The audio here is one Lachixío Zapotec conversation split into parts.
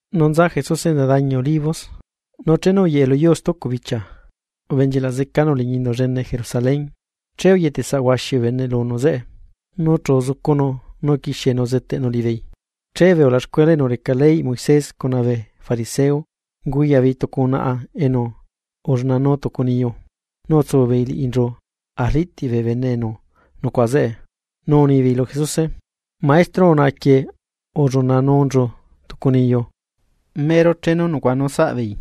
Nu nza Jesuse enza dañi Olivos, nu chenu uyeꞌe lu yuu stucu bichia, ubenchilaꞌ zecanu liñi indu llene Jerusalén, che uyetesaꞌ huaxi bee bene lunu zeꞌe, nu chu uzucunu nu uquixienu uzeteꞌnu liꞌibeei. Che bee ulaxcuela enu reca leyꞌ Moisés cuna bee fariseo, unguyaꞌbeei tucu unaꞌa enu ullunanuu tucu niyu, nu utsu beei liꞌinchu arliꞌtiꞌ bee bene enu nucuaꞌa zeꞌe. Nu unibeei lu Jesuse: ―Maestro, unaꞌaquieꞌ ullunanunchu tucu niyu mero chenu nucuaꞌanu saꞌbeei.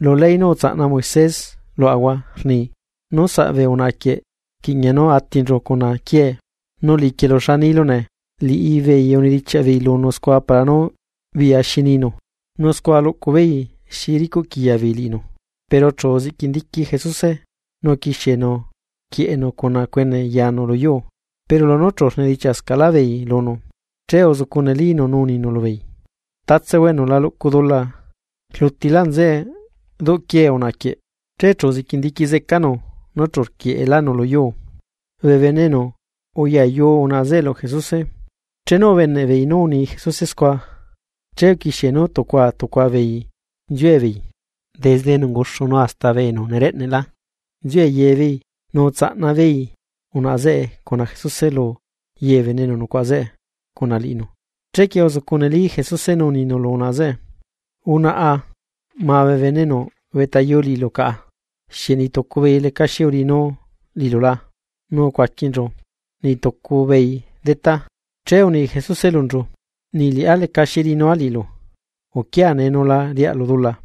Lu ley nú utsaꞌna Moisés luaꞌahua rni: ―Nú saꞌ bee unaꞌaquieꞌ, rquiꞌña nú atinchu cuna quiee, nu liꞌiquielu, ¿xa nilu nee? Liꞌibeei unidichiaꞌ beei lunu scua para nú biꞌya xi ninu, nu scua luꞌcu beei xi ricuꞌquiya beei liꞌinu, pero chu uziꞌquindiqui Jesuse, nu uquixienu rquieꞌenu cuna cuene yaanu lu yuu. Pero lunú chu rnidichiaꞌscaꞌlá beei lunu, che uzucu nelínu nu uninu lubeei: ―Tatsehua enu la luꞌcu dula, rlutilá nzeꞌe duꞌquiee unaꞌa quieꞌ. Che uziꞌquindiqui zecanu núchu rquieꞌelánu lu yuu. Bee bene enu uyayu unaꞌa zeꞌe lu Jesuse, chenu ubeneꞌ beei nú uni Jesuse scua, che uquixie nú tucua tucua beei nziue beei, desde enu unguxu nu hasta bee enu nereꞌnelá, nziue ye beei nu utsaꞌnatsia beei unaꞌa zeꞌe cuna Jesuse lu ye bee bene enu nucuaꞌa zeꞌe cuna liꞌinu. Chequie uzucu neli Jesuse nu uninu lu unaꞌa zeꞌe: ―Unaꞌa, ¿ma bee bene enu ubeꞌtayu liꞌilu caꞌa? ¿Xieꞌ niꞌtucu beei lecaxi uriꞌinu liꞌilu la? Nu ucuaquinchu: ―Niꞌtucu beei detá. Che uni Jesuse lunchu: ―Niꞌliꞌá lecaxi riꞌinua liꞌilu, uquia nee nu la riaꞌlu dula.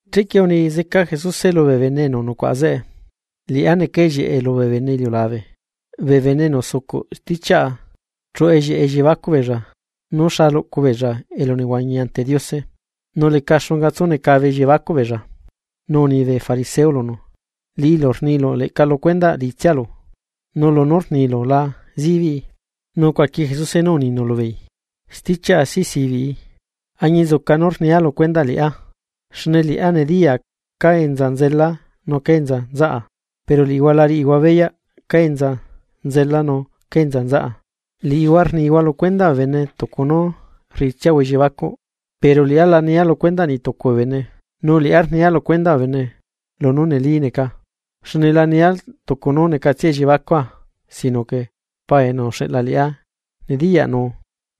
Chequie uni zeca Jesuse lubee bene enu nucuaꞌa zeꞌe: ―Liꞌá neca ellieꞌe lubee bene iliulabe. Bee bene enu zucuꞌ stichiaꞌa, chuꞌu ellieꞌe elliebacuꞌ beella, nú xa luꞌcu beella elunehuañi ante Diose, nu leca xunga tsunecabe elliebacuꞌ beella. Nu uni bee fariseo lunu: ―Liꞌilu rnilu leꞌca lu cuendaꞌ liꞌitsialu, nu lunú rnilu la zibiꞌi. Nu ucuaqui Jesuse nú uninu lubeei: ―Stichiaꞌa si zibiꞌi, añinzuca nú rnia lu cuendaꞌ liꞌá. Xne liꞌá nediyaa cá enza nzela nu cá enza nzaꞌa, pero liꞌihua la riꞌihua beyaꞌ cá enza nzela nu cá enza nzaꞌa. Liꞌihua rnihua lu cuendaꞌ bee bene tucu nú rriꞌitsiahua elliebacuꞌ. Pero liꞌá la nia lu cuendaꞌ niꞌ tucu bee bene. Nu liꞌá rnia lu cuendaꞌ bee bene, lunú neli neca. Xne la nia tucu nú necatsia elliebacua, sino que Paa enu uxeꞌla liꞌá nediyaꞌnu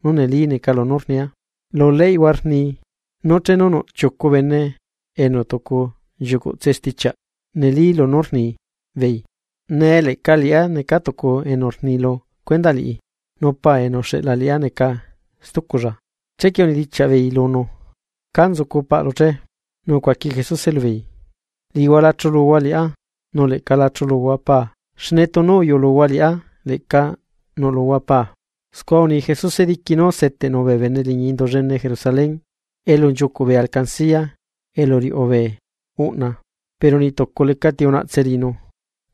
nú neli neca lunú rnia. Lu leyꞌhua rni nú chenu nuꞌ chiucu bene enu tucu nchiucuꞌtse stichiaꞌ neli lunú rnibeei. Nee leꞌca liꞌá neca tucu enu rni lu cuendaꞌ liꞌá, nu Paa enu uxeꞌla liꞌá neca stuculla. Chequie unidichiaꞌ beei lunu: ―¿Ca nzucu paꞌlu che? Nu ucuaqui Jesuse lubeei: ―Liꞌihua la chuluhua liꞌá, nu leꞌca la chuluhua Paa xne tunu uyuꞌluhua liꞌá, leꞌca nuꞌluhua Paa. Scua uni Jesuse diqui nú seteꞌnu bee bene liñi Indu llene Jerusalén elu nchiucuꞌ bee alcancía elu riuꞌu bee uꞌna. Pero niꞌtucu lecati unaꞌtse liꞌinu,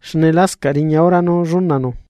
xne lascaꞌ riña hora nú llunanu.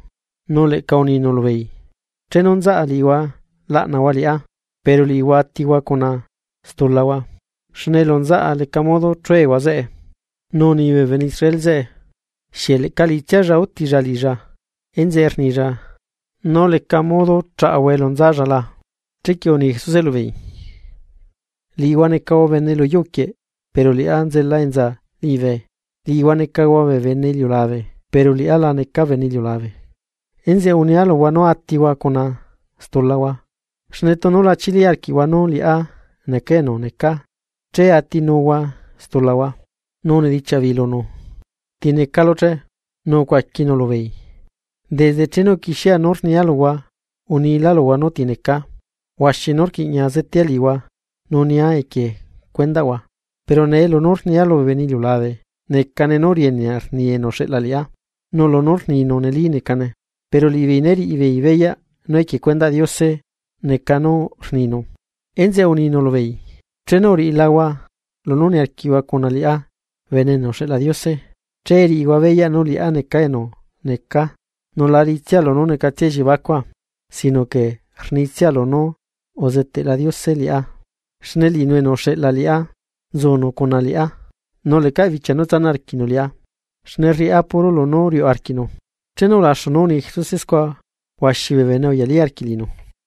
Nu leꞌca uninu lubeei: ―Chenu nzaꞌa liꞌihua laꞌnahua liꞌá, pero liꞌihua atihua cuna stulahua, xne elu nzaꞌa leca modo chuehua zeꞌe. Nu uni bee bene Israel zeꞌe: ―¿Xieꞌ leꞌca liꞌitsialla útilla liꞌilla, enzeꞌe rnilla nú leca modo chaꞌahua elu nzalla la? Chequie uni Jesuse lubeei: ―Liꞌihua necahua bene lu yuu quieꞌ pero liꞌá nzela enza liñibe, liꞌihua necahua bee bene iliulabe, pero liꞌá la neca bene iliulabe. Enzeꞌe unia luhua nú atihua cuna stulahua. Xne tunu la chili arquiꞌhua nú liꞌá neca enu necaa, che atinuhua stulahua. Nu unidichiaꞌ beei lunu: ―¿Ti necalu che? Nu ucuaquinu lubeei: ―¿Desde chenu uquixiea nú rnia luhua, unilá luhua nú ti necaa? Huaxi nú rquiꞌña zetea liꞌihua nu nia equie cuendaꞌhua. Pero nee lunú rnia lubee bene iliulabe, necane nú rienea rni enu uxeꞌla liꞌá, nu lunú rninu neli necane. Pero liꞌibeei né riꞌi beei beyaꞌ nú equie cuendaꞌ Diose neca nú rninu. Enzeꞌe uninu lubeei: ―Chenu uriꞌilahua lunú niarquiꞌhua cuna liꞌá Bene enu uxeꞌla Diose che riꞌihua beyaꞌ nú liꞌá neca enu neca, nu la riꞌitsia lunú necatsia elliebacua. Sino que rnitsia lunú uzeteꞌla Diose liꞌá. Xne liꞌinu enu uxeꞌla liꞌá nzunu cuna liꞌá nu lecaꞌ bichia nu tsanaꞌ arquiꞌnu liꞌá, xne rriꞌá puro lunú riuꞌu arquiꞌnu. Chenu ulaxu nú uni Jesuse scua, huaxi bee bene uyalí arquiꞌ liꞌinu.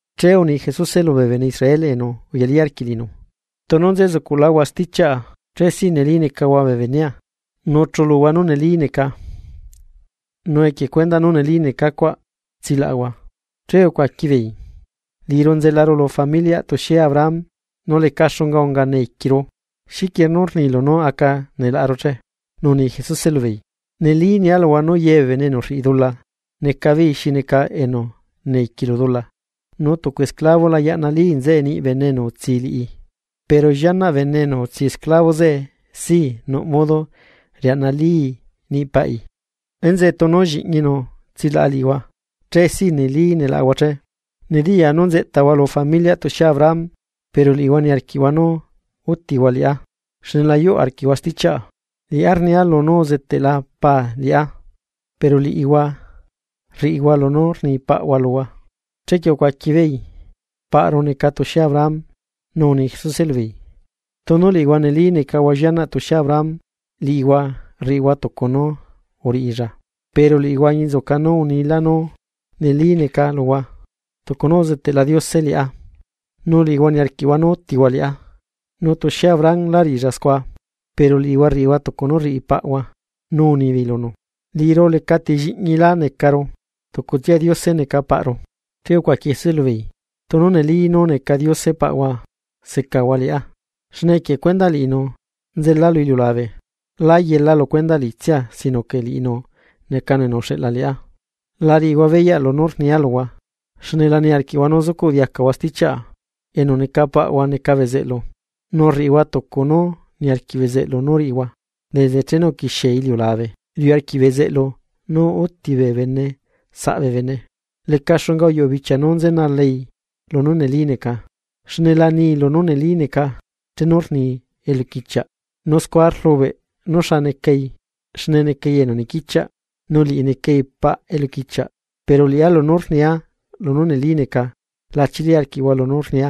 Che uni Jesuse lubee bene Israel enu uyalí arquiꞌ liꞌinu: ―Tunu nzezucuꞌláhua stichiaꞌa. Che si neli necahua bee benea. Nu chuluhua nú neli neca, nu equie cuendaꞌ nú neli neca cuaꞌ, laꞌahua. Che ucuaqui beei: ―Liꞌiru nzelaru lu familiaꞌ tuxie Abraham, nu leca xunga unga neiquiru. ¿Xiquie nú rnilu nú aca nelaꞌaru che? Nu uni Jesuse lubeei: ―Neli nia luhua nú ye bee bene enu rriꞌi dula, neca beei xi neca esclavo lu dula. Nu tucu esclavo la yaꞌnalí nzeꞌe niꞌ bene enu utsi liꞌi, pero llianaꞌ bene enu utsi esclavo zeꞌe sii nuꞌ modo riaꞌnalii niꞌ paꞌi. Enzeꞌe tunu Lliꞌñinu tsilaꞌa liꞌihua, che si neli nelaꞌahua ché. Nediyaa nú nzeꞌtahua lu familiaꞌ tuxie Abraham. Pero liꞌihua niarquiꞌhua nú útihua liꞌá, xne la yuꞌ arquiꞌhua stichiaꞌa. Liꞌá rnia lunú uzeteꞌla Paa liꞌá, pero liꞌihua rriꞌihua lunú rni paꞌhua luhua. Chequie ucuaqui beei: ―¡Paꞌru neca tuxie Abraham! Nu uni Jesuse lubeei: ―Tunu liꞌihua neli necahua llianaꞌ tuxie Abraham liꞌihua, riꞌihua tucu nú uriꞌilla. Pero liꞌihua añinzuca nu unilá nú neli neca luhua, tucu nú uzeteꞌla Diose liꞌá, nu liꞌihua niarquiꞌhua nú útihua liꞌá. ¡Nu tuxie Abraham lá riꞌilla scua! Pero liꞌihua rriꞌihua tucu nú rriꞌi paꞌhua. Nu unibeei lunu: ―Liꞌiru lecati lliꞌñilá necaru, tucutsia Diose neca paꞌru. Che ucuaqui Jesuse lubeei: ―Tunu neli nú neca Diose paꞌhua secahua liꞌá, xne equie cuendaꞌ liꞌinu nzela lu iliulabe, lá yela lu cuendaꞌ liꞌitsia sino que liꞌinu necanu enu uxeꞌla liꞌá. La riꞌihua beyaꞌ lunú rnia luhua, xne la niarquiꞌhua nú zucuꞌ diacahua stichiaꞌa. Enu neca paꞌhua neca bezeꞌlu, nu rriꞌihua tucu nú niarquiꞌ bezeꞌlu nú riꞌihua. Desde chenu uquixie iliulabe riuꞌ arquiꞌ bezeꞌlu nú úti bee bene saꞌ bee bene. Leca xunga uyuꞌu bichia nú nzenalai lunú neli neca, xne la ni lunú neli neca chenu rni eluquichiaꞌ, nu scua rlubeꞌ nuxa necai, xne necai enu niquichiaꞌ, nu liꞌi necai paꞌ eluquichiaꞌ. Pero liꞌá lunú rnia lunú neli neca, la chili arquiꞌhua lunú rnia.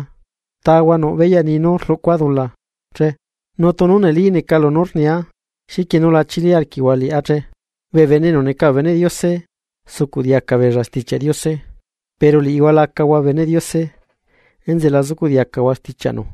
¿Tahua nuꞌ beyaꞌ ni nú rluꞌcua dula che? Nu tunu neli neca lunú rnia luhua, ¿xiquie nu la chili arquiꞌhua liꞌá che? Bee bene enu neca bee beneꞌ Diose sucuꞌ diaca beella Stichiaꞌ Diose, pero liꞌihua la acahua beneꞌ Diose, enzeꞌe la zucuꞌ diacahua stichiaꞌnu.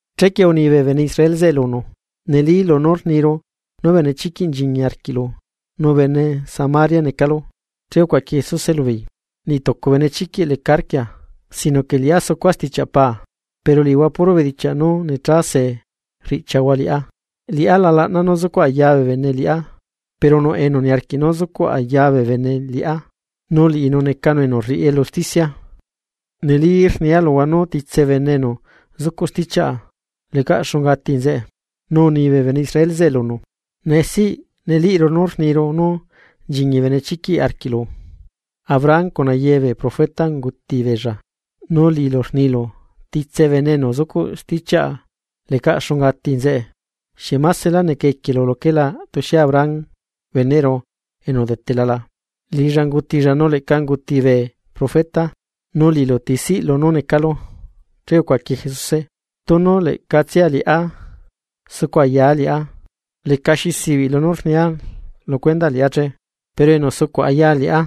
Chequie uni bee bene Israel zeꞌe lunu: ―Neli lunú rniru nú benechiquiꞌ nchiñi arquiꞌlu, nu bene Samaria necalu. Che ucuaqui Jesuse lubeei: ―Niꞌ tucu benechiquiꞌ leca arquia, sino que liꞌá sucua stichiaꞌ Paa, pero liꞌihua puro bedichiaꞌ nú necha se rriꞌchiahua liꞌá. Liꞌá la laꞌna nú zucuꞌ aya bee bene liꞌá, pero nuꞌ enu niarquiꞌ nú zucuꞌ aya bee bene liꞌá, nu liꞌinu necanu enu rriꞌi elu usticia. Neli rnia luhua nú titse bene enu zucuꞌ stichiaꞌa, lecaꞌ xunga ati nzeꞌe. Nu uni bee bene Israel zeꞌe lunu: ―Nee siꞌ neliꞌru nú rniru nú nchiñi benechiquiꞌ arquiꞌlu. Abraham cuna ye bee profeta unguti beella, nu liꞌilu rnilu: “Titse bene enu zucuꞌ stichiaꞌa lecaꞌ xunga ati nzeꞌe.” ¿Xieꞌ másela neca equielu luquelá tuxie Abraham beneꞌru enu udetela la? Liꞌilla ungutilla nu leꞌca unguti bee profeta. Nu liꞌilu. ¿Ti siꞌlu nú necalu? Che ucuaqui Jesuse: ―Tunu leꞌcatsia liꞌá sucu ayaa liꞌá, lecaxi sibiꞌ lunú rnia lu cuendaꞌ liꞌá che. Pero enu sucuꞌ aya liꞌá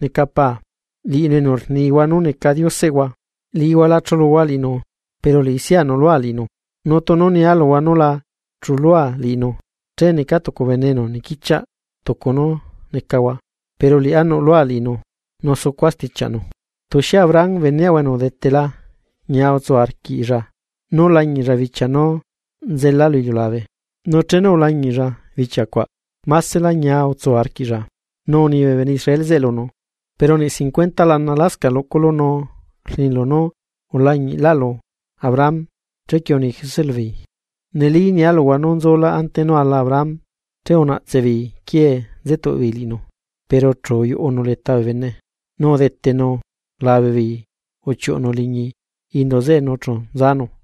neca Paa, liꞌinu enu rnihua nú neca Dioseꞌhua. Liꞌihua la chuꞌluhua liꞌinu. Pero liꞌisiꞌa nuꞌlua liꞌinu. Nu tunu nia luhua nú la chulua liꞌinu, che neca tucu bene enu niquichiaꞌ tucu nú necahua. Pero liꞌá nuꞌlua liꞌinu nu sucua stichiaꞌnu. Tuxie Abraham beneꞌhua enu udetela ñia utsu arquiꞌlla nú lañiꞌlla bichia nú nzela lu iliulabe. Nu chenu ulañiꞌlla bichia cuaꞌ másela ñia utsu arquiꞌlla. Nu uni bee bene Israel zeꞌe lunu: ―Pero niꞌ cincuenta lana lascaꞌ luꞌculu nu rnilu nú ulañiꞌlaꞌlu Abraham. Chequie uni Jesuse lubeei: ―Neli nialuhua nú nzulá ante nú ala Abraham. Che unaꞌtse beei quiee nzetuꞌ beei liꞌinu, pero chu uyuꞌunu leta bee bene, nu udetenu labe beei uchiuꞌunu liñi indu zeꞌe nu chu nzanu.